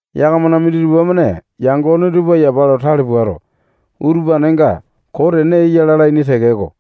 Yakamana minditupa-mane yangone tupa yapa lo tale puato, utupanenga koo tene eya lalaini tekeko,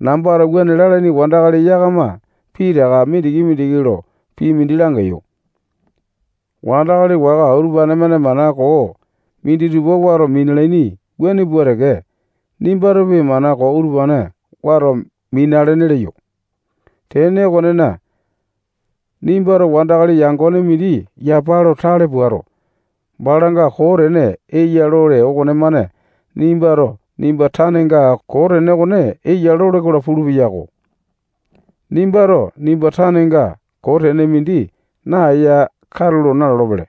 nambato wuane lalaini wandakali yakama pitaka mindiki-mindiki lo pii mindi langeyo. Wandakali waka utupane-mane mana koo minditupa wato minalaini wuane pua teke, nimbatopi mana koo utupane wato minalene leyo. Tene okonena, nimbato wandakali yangone mindi yapa lo tale puato, balanga koo tene eya lole okonemane nimbato nimba tanenga koo tene okone eya lole-kola pulu-peyako. Nimbato nimba tanenga koo tene mindi naeya katulo nalolo-pele.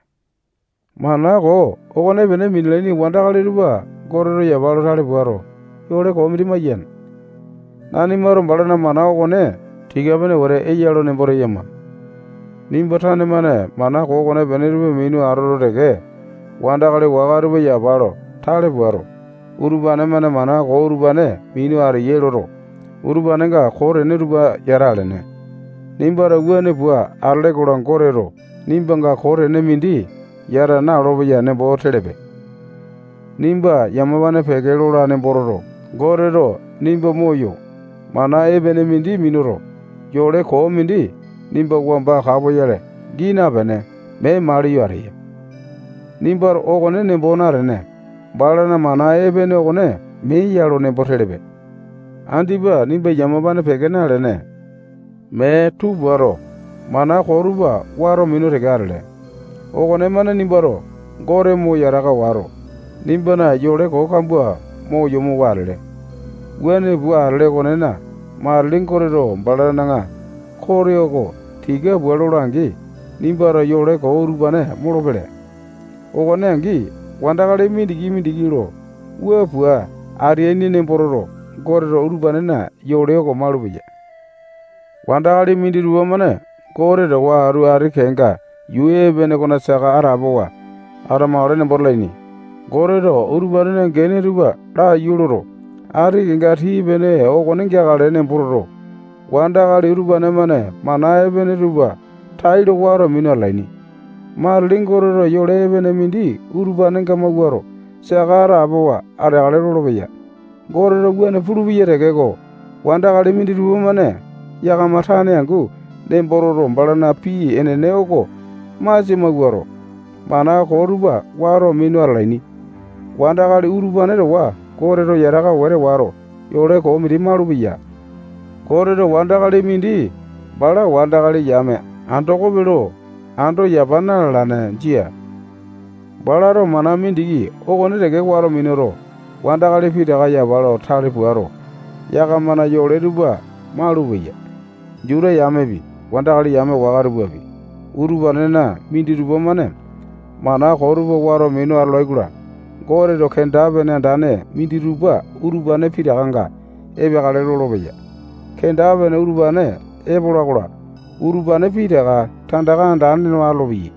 Mana koo okonepene minalaini wandakali tupa Goteto yapa lo tale puato, yole koo mindi maiyane. Nanimato balana mana okone tika-pene wete eya lo nembo teyama. Nimba tane-mane mana koo okonepene tupa minu atoto teke, wandakali waka tupa yapa lo tale puato, utupane-mane mana koo utupane minu ateyai loto, utupanenga koo tene tupa yata alene. Nimbato wuane pua atole-kola, Goteto nimbanga koo tene mindi yata na-olopeya nembo telepe. Nimba yamapane peke lola nembo toto, Goteto nimba moyo, mana epene mindi minuto, yole koo mindi nimba wamba kapoyale gii napene, mee maliyo ateya. Nimbato okone nembo natene, balana mana epene okone mee ya lo nembo telepe. Andipa nimba yamapane peke nalene, mee tuu puato, mana koo tupa wato minu teke atele okonemane nimbato Gote mo yataka wato, nimbana yole koo kambua mo yomowa atele. Wuane pua atele okonena, matili Goteto balana kote oko tika pua lola-angi, nimbato yole koo utupane molopele. Okone angi, wandakali mindiki-mindiki lo wua pua ateaini nembo toto, Goteto utupanena yole oko malupeya. Wandakali minditupa-mane Gote towa atu ati kenga yuu epene okona saka atapowa atamakale nembo talaini. Goteto utupanena gene tupa laiyu loto, ati kenga tii-pene okone geakale nembo toto, wandakali utupane-mane mana epene tupa tailo wato minu atalaini. Matili Goteto yole epene mindi utupanenga mawuato, saka atapowa ateakale lolopeya. Goteto wuane pulupeya tekeko, wandakali minditupa-mane yakama tane angu nembo toto, balana pii enene oko masia mawuato, mana koo tupa wato minu atalaini. Wandakali utupane towa Goteto yataka wete wato, yole koo mindi malupeya. Goteto wandakali mindi bala wandakali yame andokope lo ando yapa na-lalane. Jia. Balato mana mindiki okone teke wato minuto, wandakali pitaka yapa lo tale puato, yakamana yole tupa malupeya. Juta yamepi, wandakali yame waka tupapi, utupanena minditupa-mane mana koo tupa wato minu atolai-kola, Goteto kenda-pene andane minditupa utupane pitakanga epeakale lolopeya. Kenda-pene utupane epola-kola, utupane pitaka tandaka andane no atolopeyai.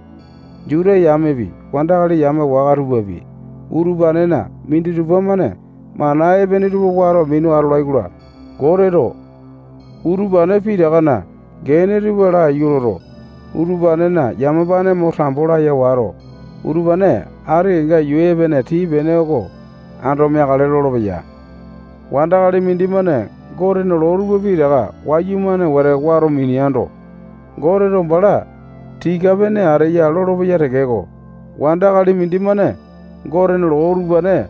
Juta yamepi, wandakali yame waka tupapi, utupanena minditupa-mane mana epene tupa wato minu atolai-kola, Goteto utupane pitakana gene tupa laiyu loto, utupanena yamapane mo tambo laya wato, utupane ati kenga yuu epene tii-pene oko ando meakale lolopeya. Wandakali mindimane Gotena loo tupa pitaka wayumane wete wato mineando, Goteto bala tika-pene ateya lolopeya tekeko, wandakali mindimane Gotena loo utupane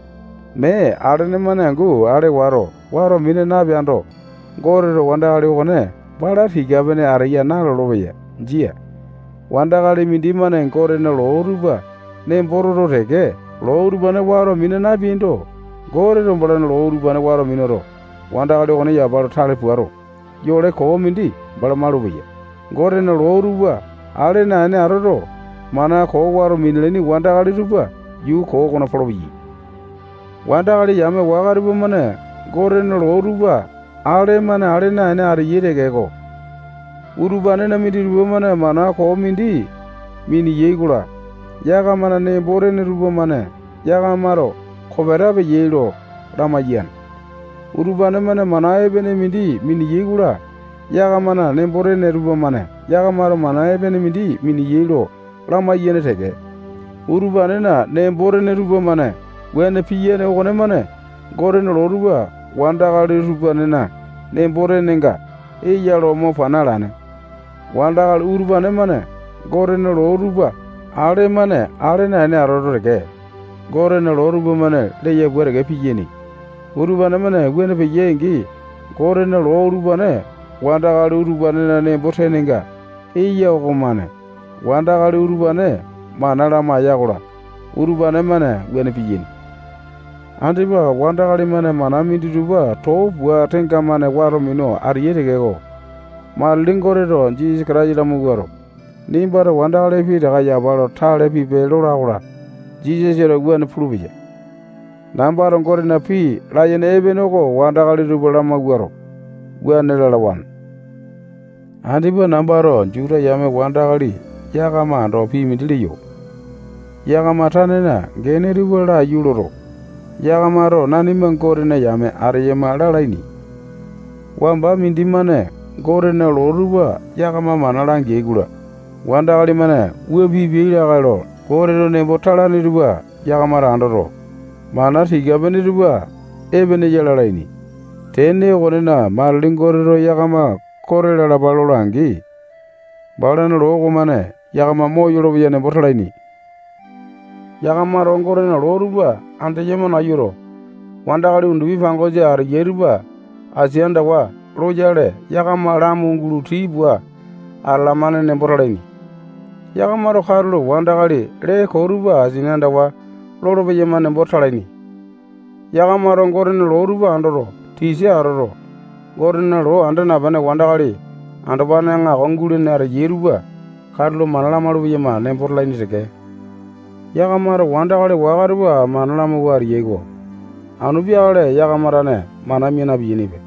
mee alene-mane angu ale wato, wato mina napeando, Goteto wandakali okone bala tika-pene ateya nalolo-peya. Jia. Wandakali mindimane Gotena loo tupa nembo toto teke, loo utupane wato mina napeaindo, Goteto balana loo utupane wato minuto, wandakali okone yapa lo tale puato, yole koo mindi utupane malupeya. Gotena loo tupa ale naene atoto, mana koo wato minalaini wandakali tupa yuu koo okona polopeyai. Wandakali yame waka tupamane Gotena loo tupa ale-mane ale naene ateyai tekeko, utupanena minditupa-mane mana koo mindi miniyai-kola, yakamana nembo-tene tupamane yakamato kopeta peyai lo lamaiyane. Utupane-mane mana epene mindi miniyai-kola, yakamana nembo-tene tupamane yakamato mana epene mindi miniyai lo lamaiyane teke. Utupanena nembo-tene tupamane wuane piyane okonemane Gotena loo tupa wandakali utupanena nembo-tenenga eya lo mo pana alane. Wandakali utupane-mane Gotena loo tupa ale-mane ale naene atoto teke, Gotena loo tupamane leya pua teke piyaini. Utupane-mane wuane peyai-angi, Gotena loo utupane wandakali utupanena nembo-tenenga eya okomane wandakali utupane mana lamaiya-kola, utupane-mane wuane piyaini. Andipa wandakali-mane mana minditupa too pua tenga-mane wato minu atalaini tekeko, matili Goteto Jisasa Kataisa lamawuato, nimbato wandakali pitaka yapa lo tale pipe lola-kola, Jisasato wuane pulupeya. Nambato Gotena pii layene epene oko wandakali tupa lamawuato, wuane lalawane. Andipa nambato Juta yame wandakali yakama ando pii mindi leyo. Yakama tanena gene tupa laiyu loto, yakamato nanima Gotena yame ateyama lalaini. Wamba mindimane Gotena loo tupa yakama mana langeai-kola, wandakali-mane wua pipiai lakae lo Goteto nembo talane tupa yakamato andoto, mana tika-pene tupa epene ya lalaini. Tene okonena, matili Goteto yakama kote lalapa lola-angi, balana loo okomane yakama moyolo-peya nembo talaini. Yakamato Gotena loo tupa andeyama nayuto, wandakali undupi pangosa ateyai tupa asia andawa loyale, yakama lamu gulo tii pua atalamane nembo talaini. Yakamato katulo wandakali lee koo tupa asini andawa lolo-peyama nembo talaini. Yakamato Gotena loo tupa andoto, tisa atoto, Gotena loo anda napene wandakali andopane aŋako gulene ateyai tupa katulo mana lamaulu-peyama nembo talaini teke. Yakamato wandakali waka tupa mana lamawua ateyai-ko. Anu peakale yakama tane mana mia na-piyainipe.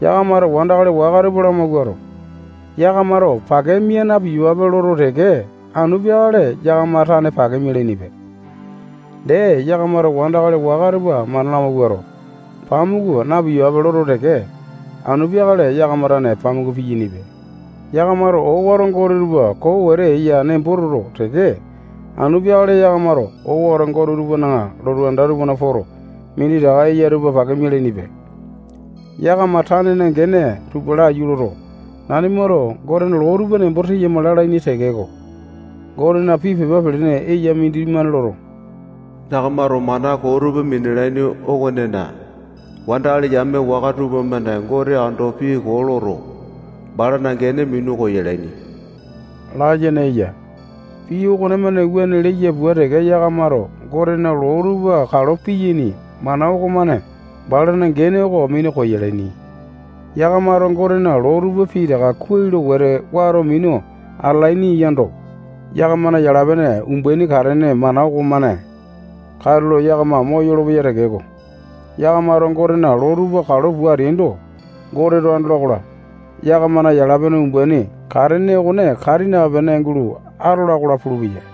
Yakamato wandakali waka tupa lamawuato, yakamato pake mia na-piyapape loto teke, anu peakale yakama tane pake mialainipe. Dee, yakamato wandakali waka tupa mana lamawuato, pamuku na-piyapape loto teke, anu peakale yakama tane pamuku piyainipe. Yakamato owato gote tupa koo wete eyai nembo toto teke, anu peakale yakamato owato gote tupana lotu anda tupana poto, minditaka eya tupa pake mialainipe. Yakama tanena gene tupa laiyu loto, nanimato Gotena loo tupa nembo teyama lalaini tekeko, Gotena pii pepa pelene eya mindimane loto, yakamato mana koo tupa minalaini okonena, wandakali yame waka tupamane Gote ando pii koo loto, balana gene minu koyalaini layene eya. Pii okonemane wuane leya pua teke, yakamato Gotena loo tupa kalo piyaini mana okomane balana gene oko minu koyalaini. Yakamato Gotena loo tupa pitaka kuai lo wete wato minu atalaini yaindo, yakamana yala-pene umbaini katene mana okomane katulo yakama moyolo-peya tekeko, yakamato Gotena loo tupa kalo pua ateaindo, Goteto andola-kola, yakamana yala-pene umbaini katene okone kati napene gulo atola-kola pulupeya.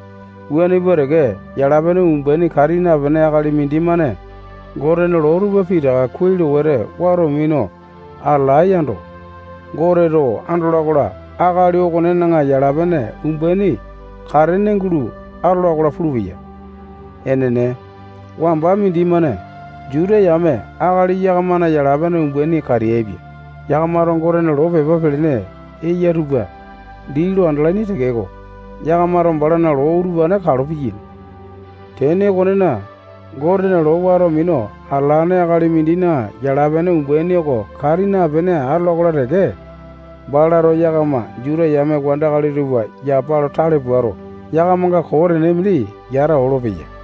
Wuane pua teke, yala-pene umbaini kati napene akali mindimane Gotena loo tupa pitaka kuai lo wete wato minu atalae yando, Goteto andola-kola, akali okonena yala-pene umbaini katene gulo atola-kola pulupeya. Enene, wamba mindimane Juta yame akali yakamana yala-pene umbaini kateaipia. Yakamato Gotena loo pepa pelene eya tupa dii lo andalaini tekeko, yakamato balana loo utupane kalo piyaini. Tene okonena, Gotena loo wato minu atalane akali mindina yala-pene umbaini oko kati napene atola-kola teke, balato yakama Juta yame wandakali tupa yapa lo tale puato, yakamanga koo tene mindi yata olopeya.